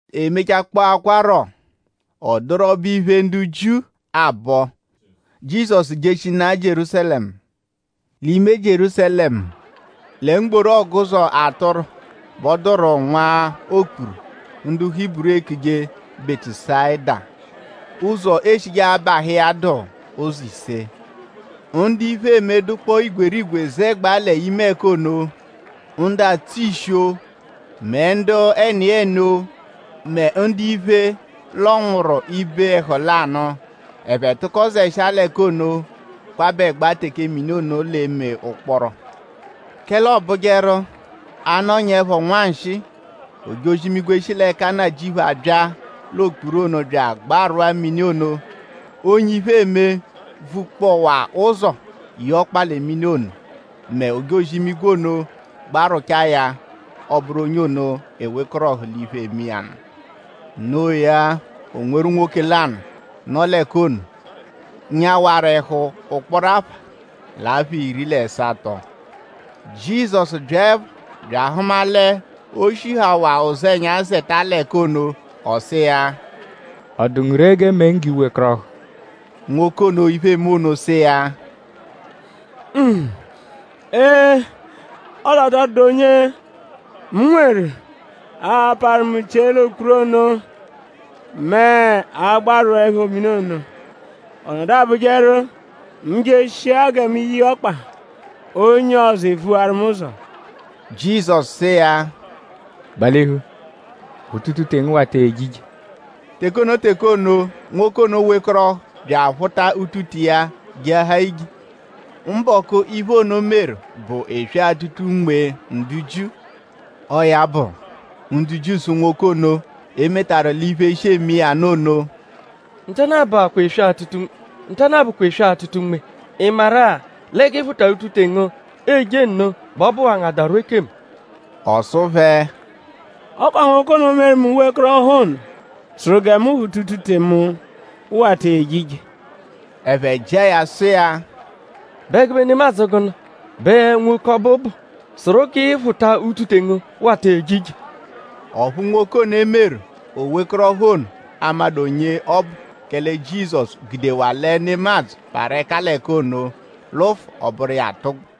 E mechakpọakwaro; ọ dụru ọbo-iphe, ndu Jiu abọ. Jizọsu jeshinaa Jierúsalẹmu. L'ime Jierúsalẹmu, lẹ mgboru Ọguzo Atụru, bẹ ọ dụru nwa okpuru, ndu Hiburu ekuje Bẹtusayida; ụzo eshije abahụ iya dụ ụzo ise. Ndu iphe eme dụkpoo igwerigwe zẹgbaa l'ime ẹka ono: ndu atsụ ishi-o mẹ ndu ẹniyeni-o mẹ ndu iphe, lọnwuru ibe ẹhu lanụ. Ẹphe tụko zẹshia l'ẹka ono kwabẹgba teke mini ono l'eme ụkporo. Kẹle ọobujeru; a -nọnyaepho nwanshịi; ojozi-imigwe, shi l'ẹka Nnajịuphu abya l'okpuru ono bya agbarwụa mini ono. Onye iphe eme, vukpọwaa ụzo ye ọkpa lẹ mini ono mẹ ojozi-imigwe ono gbarwụchaa ya; ọ bụru onye ono ewekọrohu l'iphe, eme iya nụ. Noo ya; o nweru nwoke lanụ, nọ l'ẹka ono, nyawaru ẹhu ụkporo apha l'apha iri l'ẹsato. Jizọsu byaẹpho bya ahụma l'o shihawaa ụzenya zẹta l'ẹka ono. Ọ sụ iya: “?Ọ dụ ngu ree g'e mee ngu g'i wekọrohu?” Nwoke ono, iphe eme ono sụ iya: “Ee! Ọle ọ tọ dụdu onye mu nweru, a-parụ mu chie l'okpuru ono mẹ a -gbarwụepho mini ono. Ọ nọdu abụjeru; mu -jeshia gẹ mu ye iya ọkpa; onye ọzo evuwaru mu ụzo.” Jizọsu sụ iya: “Gbalihu; phụta utute ngu wata eje ije.” Teke ono teke ono; nwoke ono wekọrohu bya aphụta utute iya jeahaa ije. Mbọku, iphe ono meru bụ eswe-atụta-unme ndu Jiu. Ọo ya bụ; ndu Jiu sụ nwoke ono, e metaru l'iphe, shi eme iya nụ ono: “Ntanụ-a bụkwa eswe-atụta-unme.?Ị maru-a lẹ g'ị phụtaru utute ngu eje nno bẹ ọ bụwaa ngu adarwụ ekemu?” Ọ sụ phẹ: “Ọ kwa nwoke ono, meru mu wekọrohu ono sụru mu gẹ mu phụta utute mu wata eje ije.” “Ẹphe jịa ya sụ iya:?Bụ ẹgube nemadzụ gụnu bẹ nwoke ọbu bụ, sụru g'ị phụta utute ngu wata eje ije?” Ọphu nwoke ono, e meru o wekọrohu ono amadụ onye ọbu kẹle Jizọsu gudewaa lẹ nemadzụ parụ ẹka l'ẹka ono lụfu ọ bụru iya atụgbu.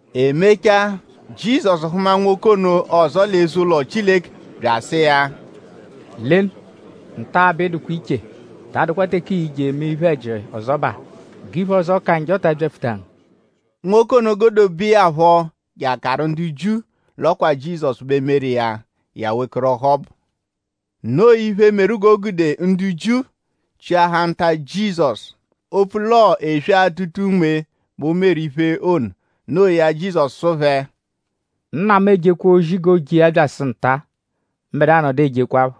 E mechaa; Jizọsu hụma nwoke ono ọzo l'eze-ụlo Chileke bya asụ iya: “Lenu; nta-a bẹ ị dụkwaa iche; ta adụkwa teke ii-je eme iphe-ẹji ọzobaa g'iphe ọzo, ka njọ ta abyapfuta ngu.” Nwoke ono godobeẹ ya phọ je akaru ndu Jiu l'ọ kwa Jizọsu bẹ meru iya; ya wekọrohu ọbu. Noo iphe, meru g'o gude ndu Jiu chịahaa nta Jizọsu; opfu l'ọo eswe-atụta-unme bẹ o meru iphe ono. Noo ya; Jizọsu sụ phẹ: “Nna mu ejekwa ozi g'ooje iya bya asụ nta-a; mbẹdua nọdu ejekwaphọ.”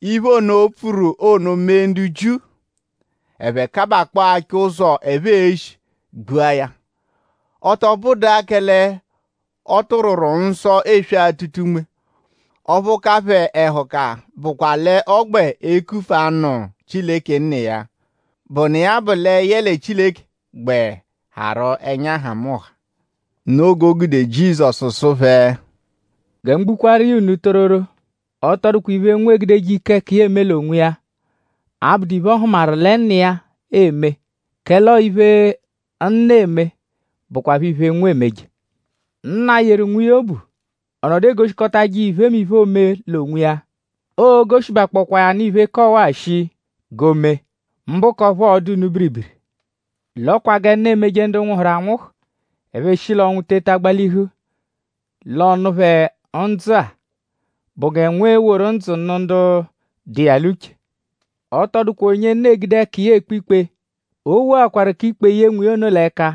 Iphe ono, o pfuru ono mee ndu Jiu; ẹphe kabakpọo achọ ụzo, ẹphe e-shi gbua ya. Ọ tọ bụdua kẹle ọ tụrwuru nsọ eswe-atụta-unme; ọphu ka phẹ ẹhuka bụkwa l'ọ gbẹ ekufua nụ Chileke Nna iya, bụnu iya bụ lẹ yẹle Chileke gbẹ harụ ẹnya nhamụnha. Noo g'o gude; Jizọsu sụ phẹ: “Gẹ mu gbukwaaru iya unu tororo; ọ tọ dụkwa iphe, Nwa egudeje ike ẹka iya eme l'onwiya; abụdu iphe, ọ hụmaru lẹ Nna iya eme; kẹle ọo iphe, Nna eme bụkwapho iphe, Nwa emeje. Nna yeru Nwa iya obu. Ọ nọdu egoshikọtaje iya iphemiphe, oome l'onwiya. Oo-goshibakpọkwaa ya nụ iphe, ka ọwa-a shii g'o mee; mbụ k'ọphu ọo-dụ unu biribiri. L'ọ kwa gẹ Nna emeje ndu nwụhuru anwụhu; ẹphe eshi l'ọnwu teta gbalihu l'ọ nụ phẹ ndzụ-a bụ gẹ Nwa e-woru ndzụ nụ ndu dụ iya l'uche. Ọ tọ dụkwa onye Nna egude ẹka iya ekpe ikpe; o wokọtaakwaru k'ikpe ye Nwa iya ono l'ẹka.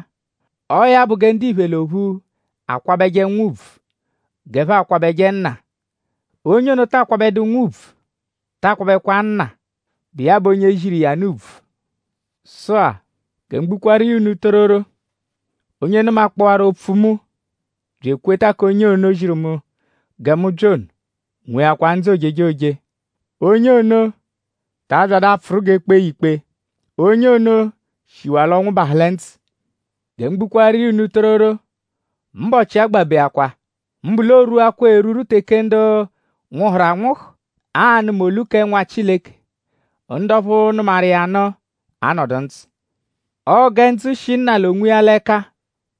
Ọo ya bụ gẹ ndiphe l'ophu akwabẹje Nwa ùbvù g'ẹphe akwabẹje Nna. Onye ono, ta akwabẹdu Nwa ùbvù ta akwabẹkwa Nna, bụ iya bụ onye ziru iya nụ. “Sụ-a; gẹ mu gbukwaaru iya unu tororo; onye nụmakpowaru opfu mu bya ekweta k'onye ono, ziru mu gẹ mu bya ono nweakwa ndzụ ojejoje. Onye ono ta abyadụ apfụru g'e kpee ya ikpe. Onye ono shiwaa l'ọnwu bahụ lẹ ndzụ. Gẹ mu gbukwaaru iya unu tororo; mbọchi agbabeakwaa; mbụ l'o rwuakwaru erwurwu teke ndu nwụhuru anwụhu a-nụma olu kẹ Nwa Chileke; ndu ọphu nụmaru iya nụ a-nọdu ndzụ. Ọo gẹ ndzụ shi Nna l'onwiya l'ẹka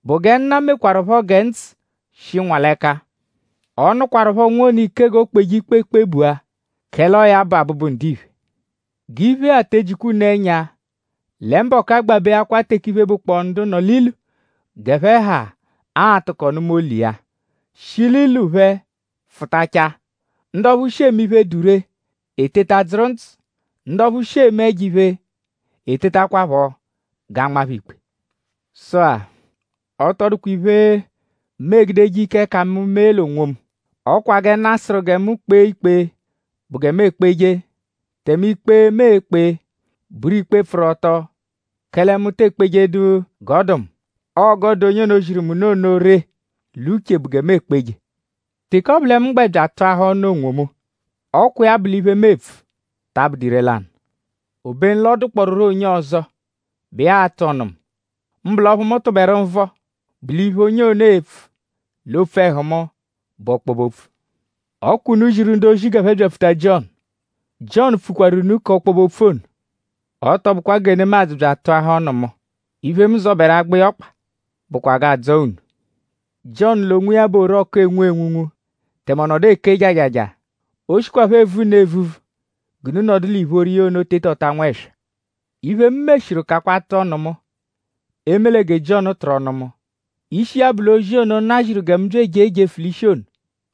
bụ gẹ Nna mekwarụpho gẹ ndzụ shi Nwa l'ẹka. Ọ nụkwarupho Nwa ono ike g'o kpeje ikpe kpebua; kẹle ọo ya bụ Abụbu-Ndiphe. G'iphe-a te ejikwa unu ẹnya; lẹ mbọku agbabeakwaa teke iphe, bụkpoo ndu nọ l'ilu g'ẹphe ha a-tụko nụma olu iya; shi l'ilu phẹ fụtachaa. Ndu ọphu shi eme iphe, dụ ree eteta dzụru ndzụ; ndu ọphu shi eme ẹjo-iphe etetakwaphọ g'a nma phẹ ikpe. “Sụ-a; ọ tọ dụkwa iphe, mu egudeje ike ẹka mu mee l'onwomu. Ọ kwa gẹ Chileke sụru gẹ mu kpee ikpe bụ gẹ mu ekpeje; tẹme ikpe, mu ekpe bụru ikpe, pfụru ọto; kẹle mu te ekpejedu g'ọ dụ mu. Ọo g'ọ dụ onye ono, ziru mu nụ ono ree l'uche bụ gẹ mu ekpeje. “Teke ọ bụ lẹ mu gbẹ bya atụahaa ọnu onwomu; ọ kwa iya bụ l'iphe, mu epfu ta abụdu ire-lanụ. Obenu l'ọ dụkpooruro onye ọzo, bụ iya a-tụ ọnu mu; mbụ l'ọphu mu tụberu nvọ bụ l'iphe, onye ono e-pfu l'opfu ẹhu mu bụ ọkpobe-opfu. Ọ kwa unu ziru ndu-ozi g'ẹphe byapfuta Jiọnu; Jiọnu pfukwaaru unu k'ọkpobe-opfu ono. Ọ tọ bụkwa gẹ nemadzụ bya atụahaa ọnu mu. Iphe, mu zọberu agba iya ọkpa bụkwa g'aa-dzọo unu. Jiọnu l'onwiya bụ orọku, enwu enwunwu; tẹme ọ nọdu eke jajaja. O shikwaphọ evu unu evuvu g'unu nọdu l'ìphóró iya ono tetọta nwẹswa. Iphe, mu meshiru kakwa atụ ọnu mu; eme lẹ gẹ Jiọnu tụru ọnu mu. Ishi iya bụ l'ozi ono, Nna ziru gẹ mu bya ejee jefu l'ishi ono;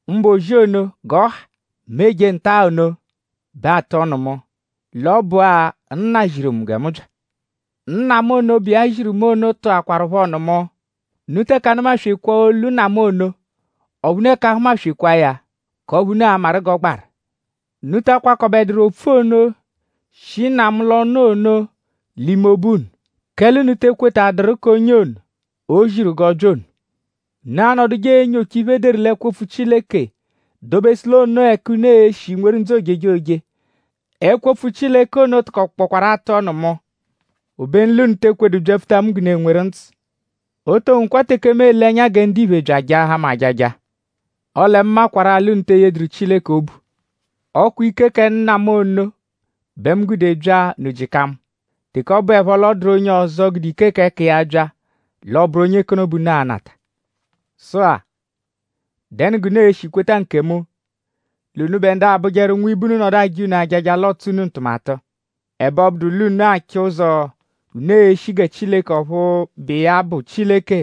mbụ ozi ono g'ọ ha, mu eje nta-a ono bẹ atụ ọnu mu l'ọ bụa Nna ziru mu gẹ mu bya. Nna mu ono, bụ iya ziru mu ono tụakwarupho ọnu mu. Unu teke anụma-swekwaa olu Nna mu ono; ọphu unu 'eke ahumaswekwaa ya; k'ọphu unu a-maru g'ọ gbaru. Unu ta akwakọbeduru opfu ono, shi Nna mu l'ọnu ono l'ime obu unu; kẹle unu te ekwetaduru k'onye ono, o ziru g'ọ bya ono. Unu anọduje enyocha iphe, e deru l'ẹkwo-opfu Chileke; dobesụ l'onoo ẹka unu e-shi nweru ndzụ ojejoje. Ẹkwo-opfu Chileke ono tụkokpokwaaru atụ ọnu mu. Obenu l'unu te ekwedu byapfuta mu g'unu enweru ndzụ. “O to nwekwa teke mu ele ẹnya gẹ ndiphe bya ajaahaa mu ajaja. Ọle mu makwarụ-a l'unu te eyeduru Chileke obu. Ọ kwa ike kẹ Nna mu ono bẹ mu gude bya; unu jịka mu. Teke ọ bụepho l'ọ dụru onye ọzo, gude ike k'ẹka iya bya; l'ọ bụru onye k'ono bẹ unu a-nata. Sụ-a;?dẹnu g'unu e-shi kweta nkemu; l'unubẹ ndu abụjeru; nwibe unu -nọdu aja unu ajaja l'ọotso unu ntụmatu. Ẹbe ọ bụdu l'unu achọ ụzo, unu e-shi gẹ Chileke ọphu bụ iya bụ Chileke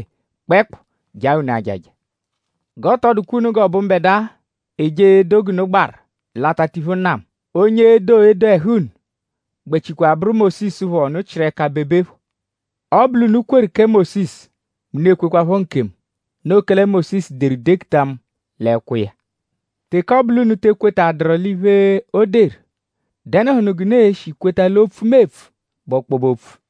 kpẹekpu jaa unu ajaja. G'ọ tọ dụkwa unu g'ọ bụ mbẹdua eje edo g'unu gbaru l'atatiphu Nna mu; onye e-do edo ẹhu unu gbẹchikwanu bụru Mósisu phọ, unu chịru ẹka bebe phọ. Ọ -bụ l'unu kweru kẹ Mósisu mẹ unu ekwekwaphọ nkemu; noo kẹle Mósisu deru dekuta mu l'ẹkwo iya. Teke ọ bụ l'unu te ekwetadụru iphe, o deru;?dẹnuhunu g'unu e-shi kweta l'opfu, mu epfu bụ ọkpobe opfu?”